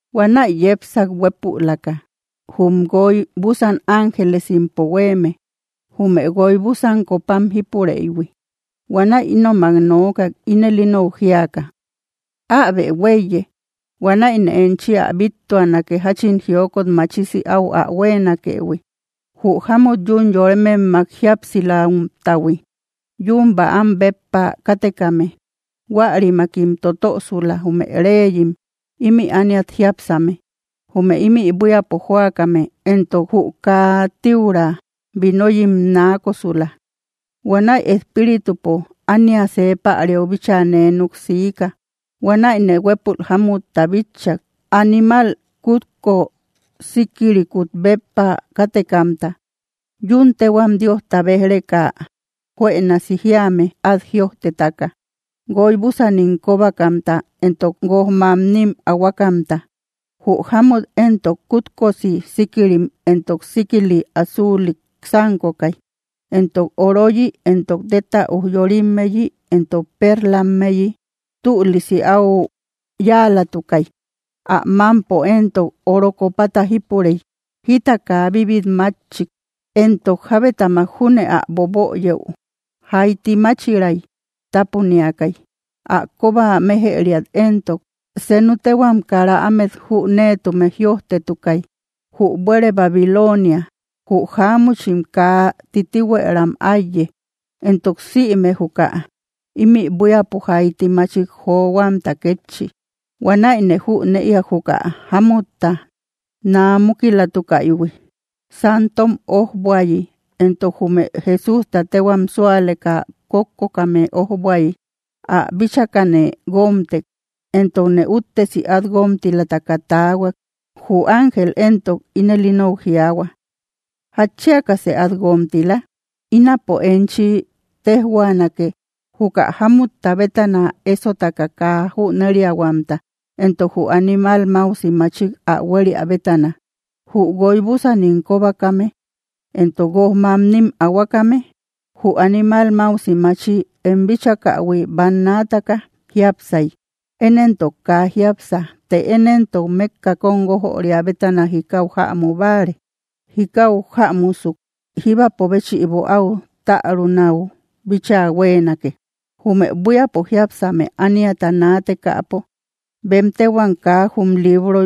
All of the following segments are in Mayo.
Huanäi yepsak huépülaka, jum guoy búsan ángelesimpo huéeme, jume guoy búsan copam jípureïhui. Huanäi ínomak nookak, ínel inou jíaka: —Äbe huéiye; huanäine enchi ä bíttuanake jáchin jiokot machisi áu ä huéenakëhui, jü jámut yún yorememmak jíapsilamtahui, yun bäam béppa kátekame. Huärimakim totösula, jume reyim ímï ániat jiápsame; jume ímï buíapo jóakame éntok, jü ä kaa tíura vinoyim naakosula. Huanäi Espíritupo ánia see päriau bíchaa nee núk siika. Huanäine huépul jámutta bitchak, animal kútko síkirikut béppa kátekamta, yún téhuam Diosta béj‑reka juënasi jíame át jïojtetaka, guoy búsanim kóbakamta entok guoj mamnim ahuakamta. Jü jámut éntok kútkosi síkirim entok síkili azuulik sánkokay, entok oroyi entok téta ujyorimmeyi entok perlammeyi tülisi áu yáalatukay. Ä mámpo éntok oro copata jípurey; jita kaa bibit máchik entok jábetamak júne ä boböyëu jaiti máchiray tápuniakay. Ä kóba méjëriat éntok, senu téhuam kara ámet jüneetume jïojtetukay: “Jü buére Babilonia, jü jáamuchim kaa titihuëram áiye, entok sïme juka ímï buíapo jaiti machik johuamta kétchi.” Huanäine jünëiak juka jámutta naa múkilatukaïhui santom ójbuayi entok jume Jesústa téhuam súaleka kókkokame ójbuayi. Ä bíchakane guómtek, entokne úttesi át guómtilataka taahuak. Jü ángel éntok ínel inou jiaahua: —¿Jatchiakasë át guómtila? Ínapo enchi téjhuaanake, juka jámutta bétana esotaka kaa jüneriahuamta, entok jü animal máusi machik ä huéria bétana, jü guoy búsanim kóbakame entok guoj mamnim ahuakame. Jü animal máusi machi em bíchakähui bannaataka jiápsay; én éntok kaa jiápsa. Të én éntok, mékka kóm guójöria bétana jikau jämu báare. Jikau jämusuk, jíbapo béchïbo áu tärunau bíchaa huéenake. Jume buíapo jiápsame ániata naatekäpo bem téhuam kaa jum libro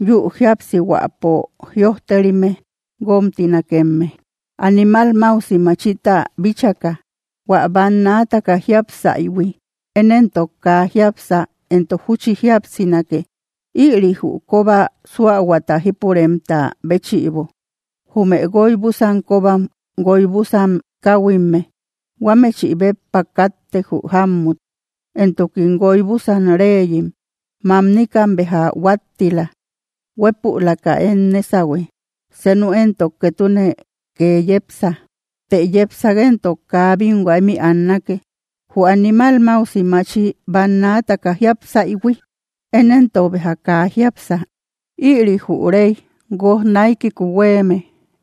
yü jíapsihuäpo jïojterime guómtinakemme, animal máusi machita bíchaka, hua bannaataka jiápsaïhui; én éntok kaa jiápsa, entok júchi jíapsinake. ’Ïri jü kóba suahuata jípuremta béchïbo: Jume guoy búsan kóbam guoy búsan káhuimme; huámechï béppa káttek, jü jámmut. Entokim guoy búsan reyim. Mamnikam béja huáttila; huépülaka én nésahue; senu éntok ketune kee yepsa; të yepsak éntok kaa bínhua ímï annake. Jü animal máusi machi bannaataka jiápsaïhui, én éntok béja kaa jiápsa. Ïri jü rey guoj naikiku huéeme,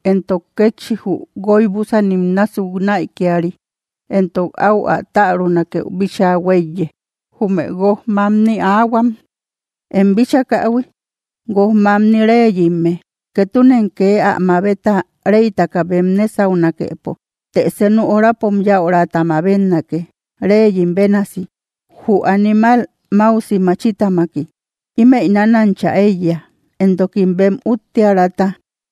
entok kétchi jü guoy búsanim násuk näikiari; entok áu ä tärunakeu bíchaa huéiye. ’Jume guoj mamni ahuam em bíchakähui, guoj mamni reyimme. Ketunem kee ä mabeta, reytaka bem nésaunakepo. Të senu horapom yäurata mabetnake, reyim bénasi, jü animal máusi machitamaki. Ímëi nanancha éiya, entokim bem úttiärata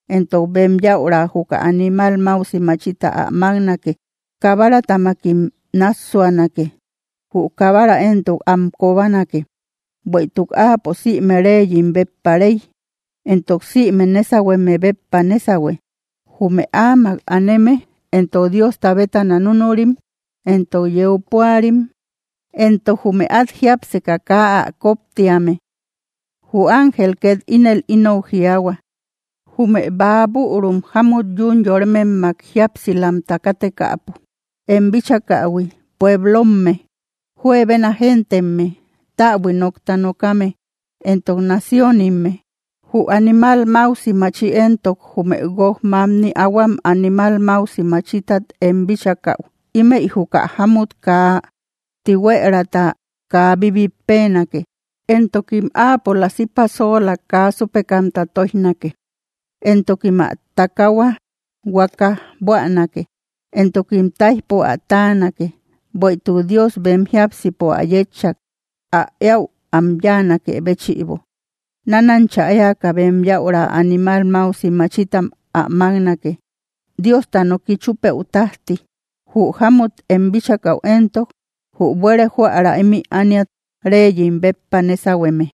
entok bem yäura juka animal máusi machita ä máknake. Kabaratamakim náassuanake; jü Kabara éntok am kobanake, bueïtuk Áapo sïme reyim béppa Rey, entok sïme nésahueme béppa nésahue. Jume Áamak aneme éntok, Diosta bétana núnurim entok yeu púarim entok jume át jiápseka kaa ä koptíame. Jü ángel két ínel inou jiaahua: —Jume bäa bürum jámut yún yorememmak jíapsilamta kátekäpo em bíchakähui, pueblomme; juebena gentemme, täbui nókta nokame, entok naciónimme. Jü animal máusi maachi entok jume guoj mamni ahuam animal máusi machitat em bíchakäu, ímëi juka jámut kaa tihuëraata kaa bíbit péenake, entokim áapola sipasola kaa súpekamta tóijnake, entokim ä takahua huakaj buänake, entokim táijpo ä táanake. Bueïtuk Dios bem jiápsipo ä yétchak, ä éäu am yáanakë béchïbo: nánancha éaka bem yäura animal máusi machitam ä máknake, Diosta noki chúpëu tájti. Jü jámut em bíchakäu éntok, jü buére jóära ímï ániat reyim béppa nésahueme.